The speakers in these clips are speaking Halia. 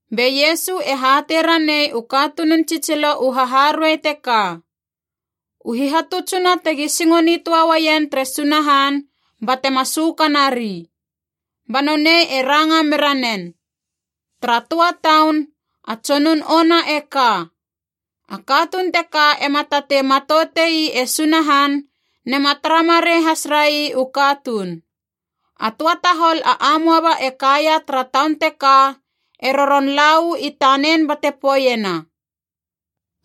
Be Iesu e hatei ranei u katunun tsitsilo u haharuei teka, u hihatutsuna tegi singo nitöa uaien tere Sunahan batema sökanari. Ba nonei e ranga mera nen, “Tara töa taun, a tsonun ona e ka. A katuun teka ema tatei matoute ii e Sunahan nema tara marei has rai u katuun. A töa tahol a amoaba e kaia tara taun teka e roron lala uu i tanen bate poeiena,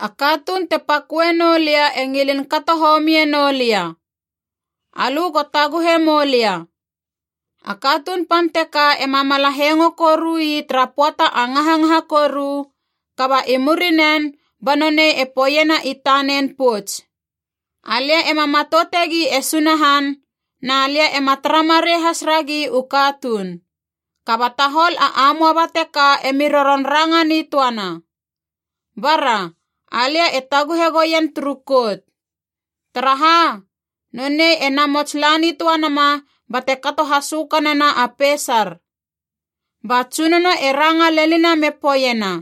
‘A katuun te paköe noulia e ngilin kato homie noulia. Alö go taguhe moulia.’ A katuun pan teka ema mala hengo koru ii tara pöata a ngangaha koru, kaba i murinen ba nonei e poeiena i tanen pouts, ‘Alia ema matoutegi e Sunahan, na lia ema tara marei has ragi u katuun. Kaba tahol a amoaba teka emi roron ranga nitöana. Bara, alia e taguhe goien turu kout. Taraha? Nonei e namots la nitöa nama bate kato hasökanena a peisar.’” Ba Tsunono e ranga lenina me poeiena,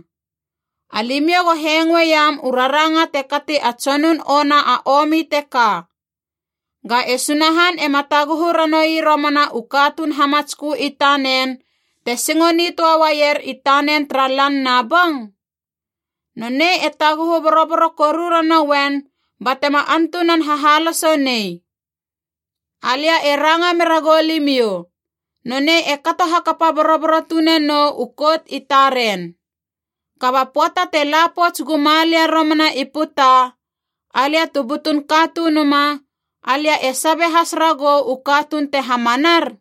“Alimiou go hengoeiam u raranga te kati a tsonun ona a omi teka. Ga e Sunahan ema taguhu ranoui romana u katuun hamatskö i tanen te singo nitöa uaier i tanen tara lan na bong? Nonei e taguhu boroboro koru ranouen batema antunan hahaloso nei. Alia e ranga meragou limiou, nonei e kato hakapa boroboro tune nou u kout i taren. Kaba pöata te la pouts guma lia romana i puta, alia tu butun Katunuma, alia e sabe has ragou u katuun te hamanar?”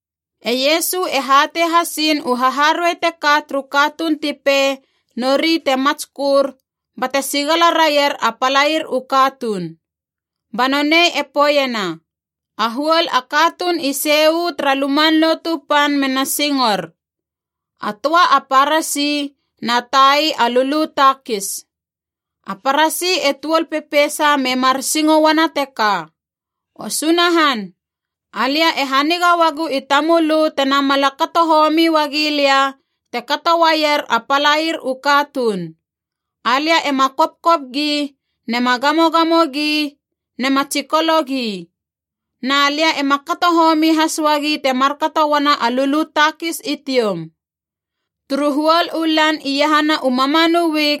E Iesu e hatei hasiin u haharuei teka turu katuun ti pei nori te matskör bate sigala raier a palair u katuun. Ba nonei e poeiena, “A huol a katuun i sei uu tara Luman Lotu Pan mena singor. A töa a Parasi, na tai a lulu takis. A Parasi e tuol pepeisa me mar singo uana teka, ‘O Sunahan, alia e haniga uagu i tamölö te namala kato homi uagi lia te kato uaier a palair u katuun. Alia ema kopkop gi, nema gamogamo gi, nema tsikolo gi. Na lia ema kato homi has uagi te markato uana a lulu takis i tioum. Turu huol u lan iahana u mamanu wik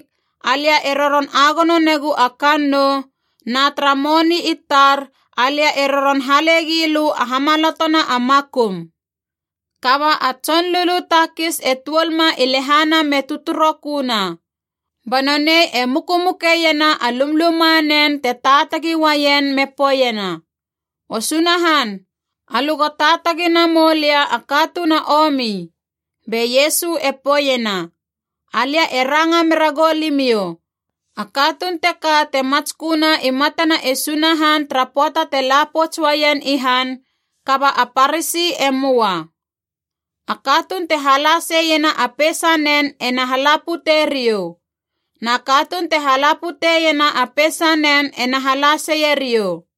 alia e roron agono negu a kannou, na tara moni i tar alia e roron hale gilö a hamalotona a makum.’ Kaba a tson lulu takis e tuol ma i lehana me tötöroköna. Ba nonei e mukumukeiena a lumlumanen te taatagi uaien me poeiena, ‘O Sunahan, alö go taatagi namoulia a katuun a omi.’” Be Iesu e poeiena, “Alia e ranga mera goulimiou, a katuun teka te matsköna i matana e Sunahan tara pöata te la pouts uaien i han, kaba a Parasi e möa. A katuun te hala seiena a peisanen ena hala putei riou. Na katuun te hala puteiena a peisanen ena hala seie riou.”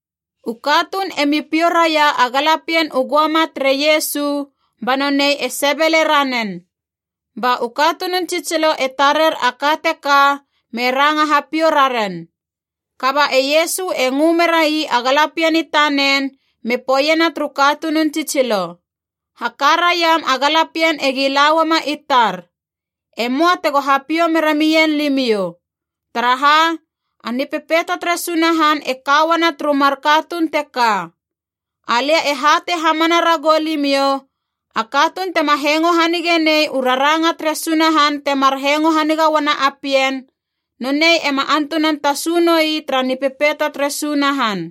U katuun e mi piou raia a galapien u göama tere Iesu ba nonei e sebele ranen. Ba u katunun tsitsilo e tarer a ka teka me ranga hapiou raren. Kaba e Iesu e ngö merai a galapien i tanen me poeiena turu katunun tsitsilo, “Haka raiam a galapien egi la uama i tar. E möa tego hapiou mera mien limiou. Taraha? A Nipepeito tere Sunahan e ka uana turu mar katuun teka. Alia e hatei hamana ragou limiou, a katuun tema hengo hanige nei u raranga tere Sunahan temar hengo haniga uana a pien, nonei ema antunan tasu noi tara Nipepeito tere Sunahan.”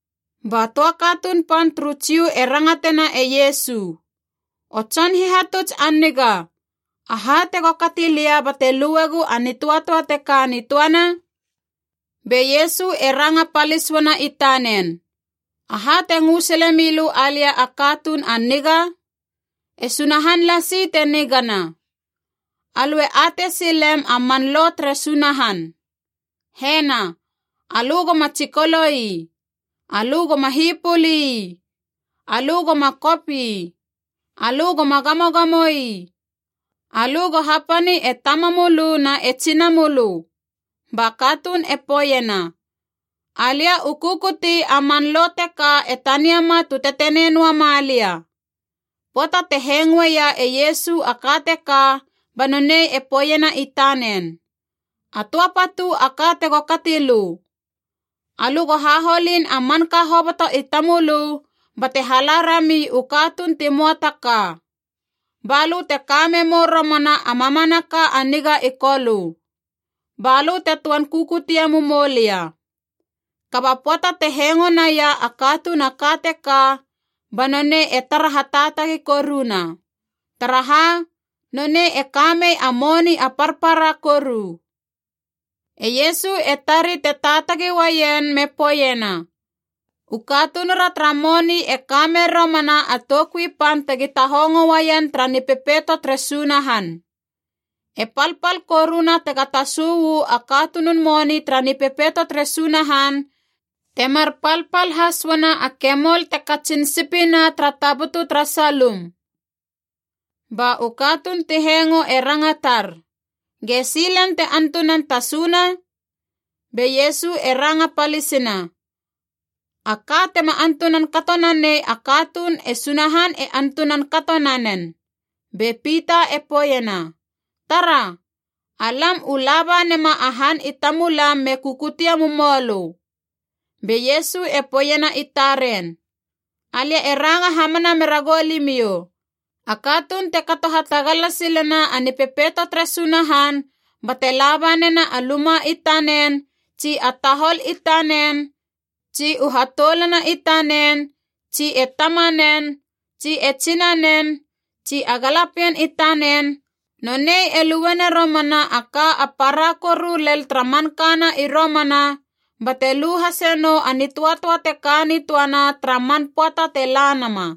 Ba töa katuun pan turu Jiu e rangatena e Iesu, “O Tson Hihatuts a niga, aha tego kati lia bate luegou a nitöatöa te ka nitöana?” Be Iesu e ranga palis uana i tanen, “Aha te ngö sile milö alia a katuun a niga? E Sunahan lasi te nigana. Alö e atei silem a man lo tere Sunahan. Hena: ‘Alö goma tsikolo ii. Alö goma hipuli ii. Alö goma kop ii. Alö goma gamogamo ii. Alö go hapani e tamamölö na e tsinamölö.’” Ba katuun e poeiena, “Alia u kukuti a man lo teka e taniama tu tetenei noa ma lia.” Pöata te hengoeia e Iesu a ka teka, ba nonei e poeiena i tanen, “A töa patu a ka tego kati lö. Alö go haholin a manka hoboto i tamölö bate hala rami u katuun ti möa ta ka. Ba lö te ka memou romana a mamanaka a niga i Kolö. Ba lö te töan kukutie mumou lia.” Kaba pöata te hengo naia a katuun a ka teka, ba nonei e tara hataatagi koruna. Taraha? Nonei e ka mei a moni a parpara koru. E Iesu e tari te taatagi uaien me poeiena, “U katunura tara moni e ka mer romana a toukui pan tegi tahongo uaien tara Nipepeito tere Sunahan! E palpal koruna tega tasu uu a katunun moni tara Nipepeito tere Sunahan, temar palpal has uana a kemol te katsin sipina tara tabutu tara salum.” Ba u katuun ti hengo e rangatar, “Gesi len te antunan tasuna?” Be Iesu e ranga palisina, “A ka tema antunan kato nanei a katuun e Sunahan e antunan kato nanen.” Be Pita e poeiena, “Tara! Alam u laba nema a han i tamulam me kukutie mumoulö.” Be Iesu e poeiena i taren, “Alia e ranga hamana mera goulimiou, a katuun te kato hatagala silena a Nipepeito tere Sunahan bate laba nena a luma i tanen tsi a tahol i tanen tsi u hatoulana i tanen tsi e tamanen tsi e tsinanen tsi a galapien i tanen, nonei e luena romana a ka a para koru lel tara mankana i romana, bate lu hase nou a nitöatöa te ka nitöana tara man pöata te la nama.”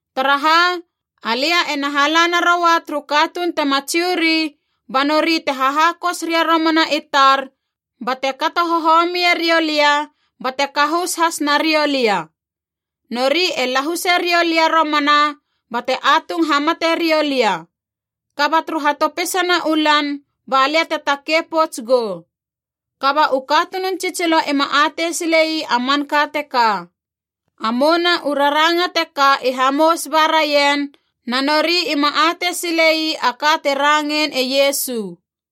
Taraha? Alia ena hala naroua turu katuun tema Jiu ri, ba nori te hahakos ria romana i tar bate kato hohomie riou lia bate kahus has nariou lia. Nori e lahuse riou lia romana bate atung hamate riou lia. Kaba turu hatopisana u lan ba lia te takei pouts gou.” Kaba u katunun tsitsilo ima atei sile ii a manka teka. A mouna u raranga teka i hamous ba raien, na nori ima atei sile ii a ka te rangein e Iesu.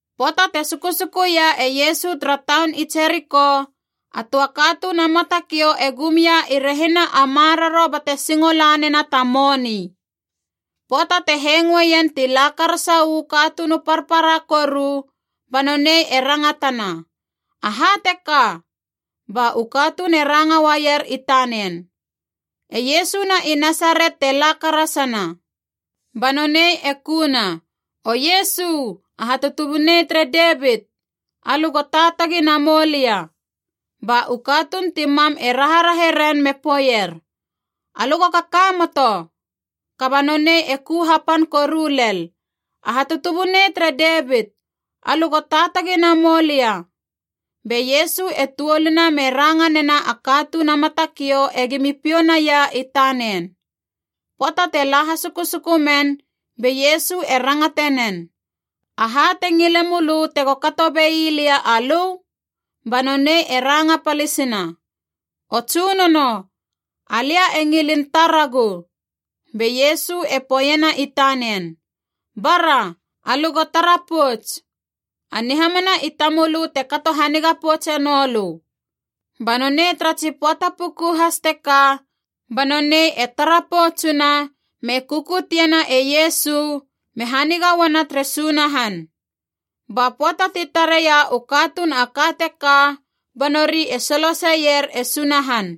Pöata te sukusukuia e Iesu tara taun i Jeriko, a töa katuun a matakiou e gum ia i rehina a maroro bate singo la nena ta moni. Pöata te hengoeien ti la karasa uu katuun u parpara koru ba nonei e rangatana, “Aha teka?” Ba u katuun e ranga uaier i tanen, “E Iesu na i Nasaret te la karasana.” Ba nonei e kuna, “O Iesu! A hatutubunei tere Devit! Alö go taatagi namoulia!” Ba u katuun ti mam e raharahe ren me poeier, “Alö go kakamoto!” Kaba nonei e ku hapan koru lel, “A hatutubunei tere Devit! Alö go taatagi namoulia!” Be Iesu e tuoluna me ranga nena a katuun a matakiou egimi piou naia i tanen. Pöata te la hasusuku men, be Iesu e rangate nen, “Aha te ngile mölö tego kato bei lia alö?” Ba nonei e ranga palisina, “O Tsunono, alia e ngilin taragu.” Be Iesu e poeiena i tanen, “Bara, alö go tara pouts! A nihamana i tamölö te kato haniga poutse noulö.” Ba nonei tara tsi pöata puku has teka ba nonei e tara poutsuna, me kukutiena e Iesu me haniga uana tere Sunahan. Ba pöata ti tareia u katuun a ka teka, ba nori e soloseier e Sunahan.